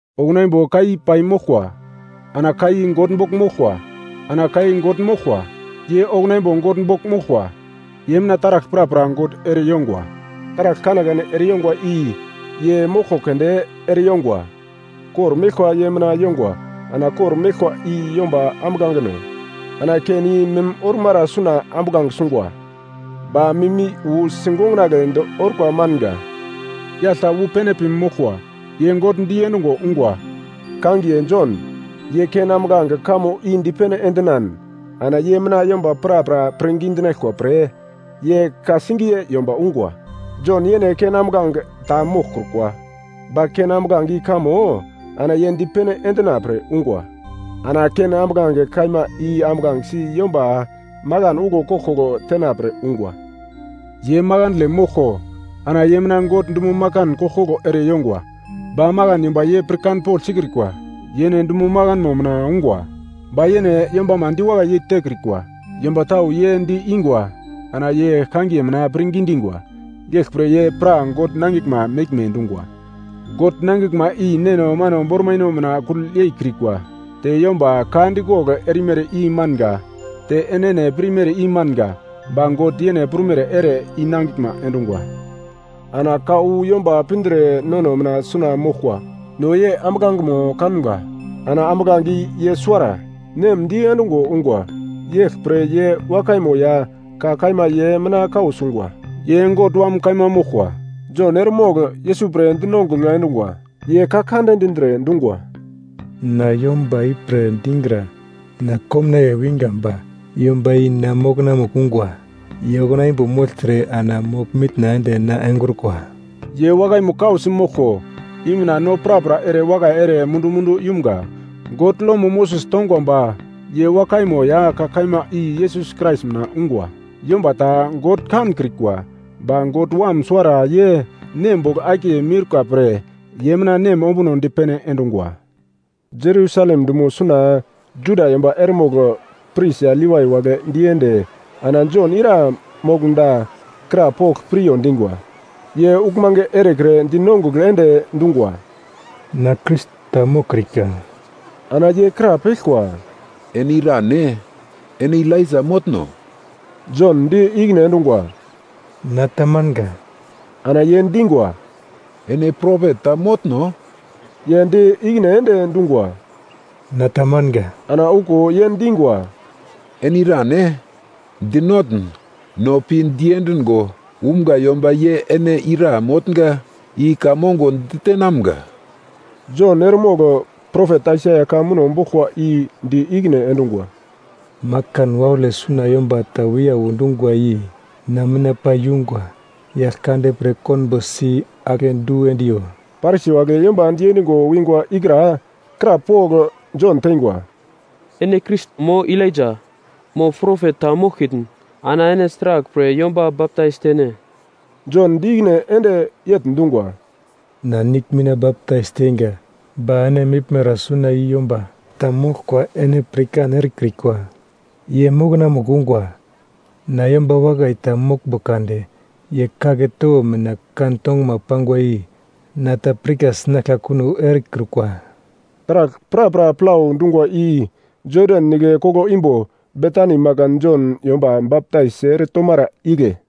Okuna imbo Ka i pai moglkwa. Ana Ka i God bogl moglkwa. Ana Ka i God moglkwa. Ye okuna imbo God bogl moglkwa. Ye mina taragl prapra God ere yongwa, taragl kanekane ere yongwa i ye moglko keunde ere yongwa. Kor meglkwa ye mina yongwa ana kor-meglkwa i yomba ambuglangeno. Ana ken i mim ormara suna ambuglange sungwa, ba mim i wu sigongonagledi orkwa manga. Yagl ta wu pene pi moglkwa ye God diendungo ungwa, kangiye Jon. Ye ken ambuglange kamo i dipene endinan ana ye mina yomba prapra pirngi dinaglkwa pre ye ka-singiye yomba ungwa. Jon yene ken ambuglange ta moglkrukwa, ba ken ambuglange i kamo ana ye dipene endina pre ungwa. Ana ken ambuglange kaima i ambuglangesi yomba makan uglo koglkoglo tenapre ungwa. Ye makandle moglko ana ye mina God dumo makan koglkoglo ere yongwa ba makan yomba ye pirkanpogl sikrikwa. Yene dumo makanmo mina ungwa. Ba yene yombama diwakai yeitekrikwa. Yomba tau ye di-ingwa ana ye kangiye mina pirngi dingwa, yeglpre ye pra God nangiglma meglme dungwa. God nangiglma i neno mano bormaino mina kugl yei kiurika te yomba ka dikogl erimere i manga te enene pirmere i manga ba God yene prumere ere i nangiglma endungwa. Ana Ka wu yomba pindre nono mina suna moglkwa. No ye ambuglangemo kamga. Ana ambuglange i ye suwara, Nem diendungo ungwa. Yeglpre ye wakaimo ya Ka kaima ye mina kau sungwa. Ye God Wam kaima moglkwa. Jon eremogl Yesus pre dinongugl endungwa, ye ka kande dindre dungwa, “Na yomba ipre dingra, na komnaiye winga ba yomba i na mokonamugl ungwa, ye okuna imbo mogltre ana mogl-mitna ende na engrukwa.” Ye wakaimo kausi moglko i mina no prapra ere wakai ere mundu-mundu yumga. God lomo Moses tongwa ba ye wakaimo ya ka kaima i Yesus Krais mina ungwa. Yomba ta God kankrikwa, ba God Wam suwara ye Nem bogl akiye miurka pre ye mina Nem ombuno dipene endungwa. Jerusalem dumo suna Juda yomba eremogl pris ya Levai wagle diende ana Jon ira moglmda krapogl piryo dingwa. Ye uglmange erekre dinongugl ende dungwa, “Na Krais ta moglkrikwa.” Ana ye krapeglkwa, “Ene irane? Ene Elaija motno?” Jon di ikine endungwa, “Na tamanga.” Ana ye dingwa, “Ene Propet ta motno?” Ye di ikine ende dungwa, “Na tamanga.” Ana okuwo ye dingwa, “Ene irane? Dinotn no pi diendigo umga yomba ye ene ira motnga i ka mongo ditenamga.” Jon eremogl propet Aisaia ka muno boglkwa i di ikine endungwa, “Makan waule suna yomba ta wiyau dungwa i na mina pai yungwa. Yaglkande pre konbo si-ake du endiyo.” Parisi wagle yomba diendingo wingwa ikra krapogl Jon teingwa, “Ene Krais mo Elaija, mo Propet ta moglkitn ana ene sraglpre yomba baptais tene?” Jon di ikine ende yegl dungwa, “Na nigl mina baptais teinga, ba ene meglmara suna i yomba ta moglkwa ene pirkan erekrikwa. Ye mokonamugl ungwa, na yomba wakai ta moglmbo kade ye kagle towo mina kan tonguma pangwa i na ta pirka sinaglka kuno erekrukwa.” Taragl prapra plau dungwa i Jodan Nigle koglo imbo Betani makan Jon yomba baptais ere tomara igle.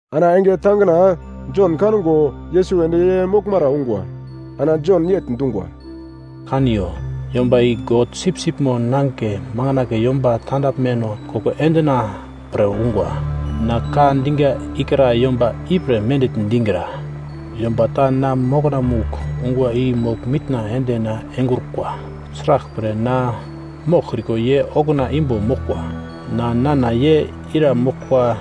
Ana enge tangina Jon kango Yesus ende ye moglmara ungwa. Ana Jon yegl dungwa, “Kaniyo, Yomba i God Sipsipmo Nangigle makandle yomba tandaglmeno koko endina pre ungwa. Na ka dinga ikra yomba ipre mendigl digra, ‘Yomba ta na mokonamugl ungwa i mogl-mitna ende na engrukwa. Sraglpre na moglkriko ye okuna imbo moglkwa.’ Na nana ye ira moglkwa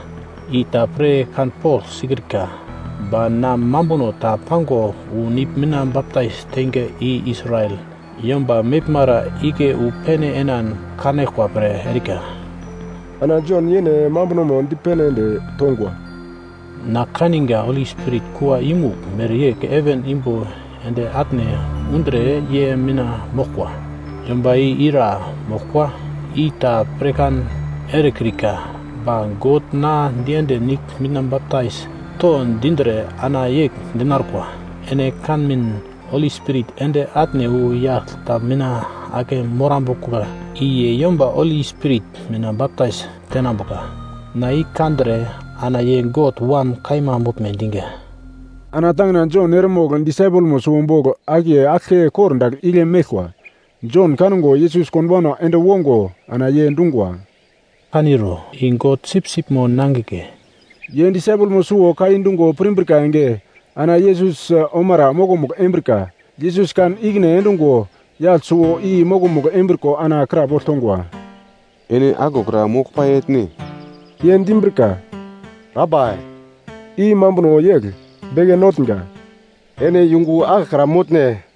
i ta pir kanpogl sikrika, ba na mambuno ta pango wu nigl mina baptais teinga i Israel yomba meglmara igle wu pene enan kanaglkwa pre erika.” Ana Jon yene mambunomo dipene ende tongwa, “Na kaninga Holi Spirit kua yumugl mereyegl heven imbo ende atne undre ye mina moglkwa. Yomba i ira moglkwa, i ta pirkan erekrika, ba God na diende nigl mina baptais to dindre ana yegl dinarkwa, “Ene kanmin Holi Spirit ende atne wu yagl ta mina ake morambuka i ye yomba Holi Spirit mina baptais tenambuka. Na i kandre, ana ye God Wam kaima moglme dinga. Ana tangina Jon eremogl disaipelmo suwo bogl akiye aglke kordagl igle meglkwa. Jon kango Yesus konbauna ende wongo ana ye dungwa, “Kaniro, i God Sipsipmo Nangigle.” Ye disaipelmo suwo ka i dungo pirmbrika enge, ana Yesus omara mokomugl embrika. Yesus kan ikine endungo yagl suwo i mokomugl embriko ana krapogl tongwa, “Ene aglokra moglpai etne?” Ye dimbrika, “Rabai” (i mambuno yegl, Beke Notnga), “Ene yungu aglokra motne?”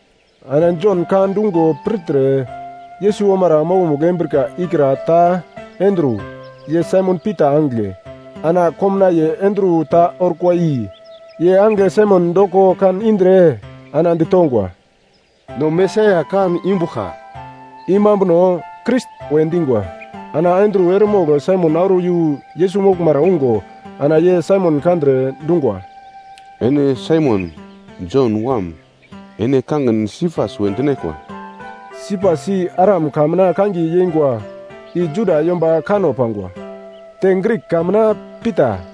Ana Jon ka dungo pirtre, Yesus omara mokomugl embrika ikra ta Andru, ye Saimon Pita angigle. Ana komnaiye Andru ta orkwa i, ye angigle Saimon doko kan indre ana ditongwa, “No Mesaia kan imbuglka.” (I mambuno Krais we dingwa.) Ana Andru eremogl Saimon auro yu Yesus moglmara ungo ana ye Saimon kandre dungwa, “Ene Saimon, Jon wam. Ene kangin Sipas we dinaglkwa.” Sipas i Aram ka mina kangiye yeingwa, i Juda yomba kanno pangwa. Te Grik ka mina Pita.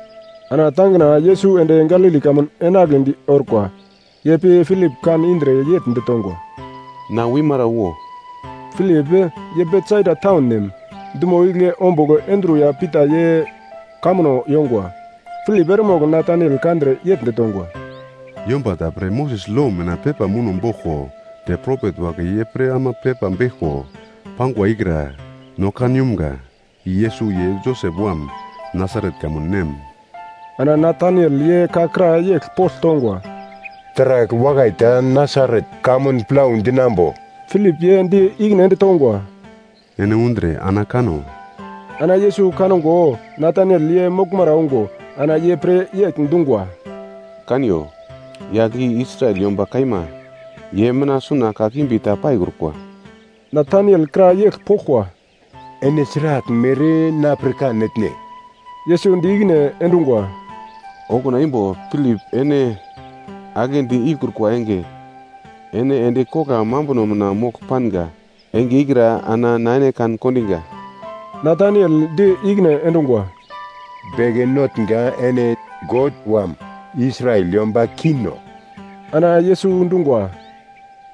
Ana tangina Yesus ende Galili kamun enagledi orkwa. Ye pi Pilip kan indre yegl ditongwa, “Na wimara wo.” Pilip, ye Betsaida taun nem, dumo igle ombugl Andru ya Pita ye kamuno yongwa. Pilip eremogl Nataniel kandre yegl ditongwa, “Yomba ta pre Moses lo mina pepa muno boglko te propet wagle ye pre ama pepa beglko pangwa ikra no kan yumga. I Yesus ye Josep wam. Nasaret kamun nem.” Ana Nataniel ye ka kra yegl pogl tongwa, “Taragl wakai ta Nasaret kamun plau dinambo?” Pilip ye di ikine ende tongwa, “Ene undre ana kano.” Ana Yesus kango Nataniel ye moglmara ungo ana ye pre yegl dungwa, “Kaniyo, yagl i Israel yomba kaima, ye mina suna kakimbi ta paikrukwa.” Nataniel kra yegl poglkwa, “Ene sraglmere na pirkan etne?” Yesus di ikine endungwa, “Okuna imbo Pilip ene aglendi ikrukwa enge ene endi kogla mambuno mina mogl panga enge ikra, ana na ene kan-kondinga.” Nataniel di ikine endungwa, “Beke Notnga, ene God Wam, Israel yomba Kingno.” Ana Yesus dungwa,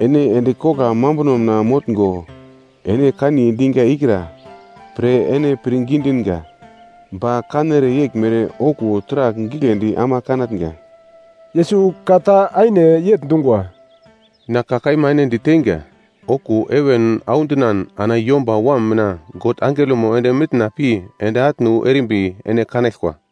“Ene endi kogla mambuno mina motngo, ene kaniye dinga ikra pre ene pirngi dinga ba kanere yeglmere okuwo taragl giglendi ama kanatnga.” Yesus ka ta aine yegl dungwa, “Na ka kaima ene diteinga, okuwo heven audinan ana Yomba Wam mina God angelomo ende mitna pi ende atne wu erimbi ene kanaglkwa.”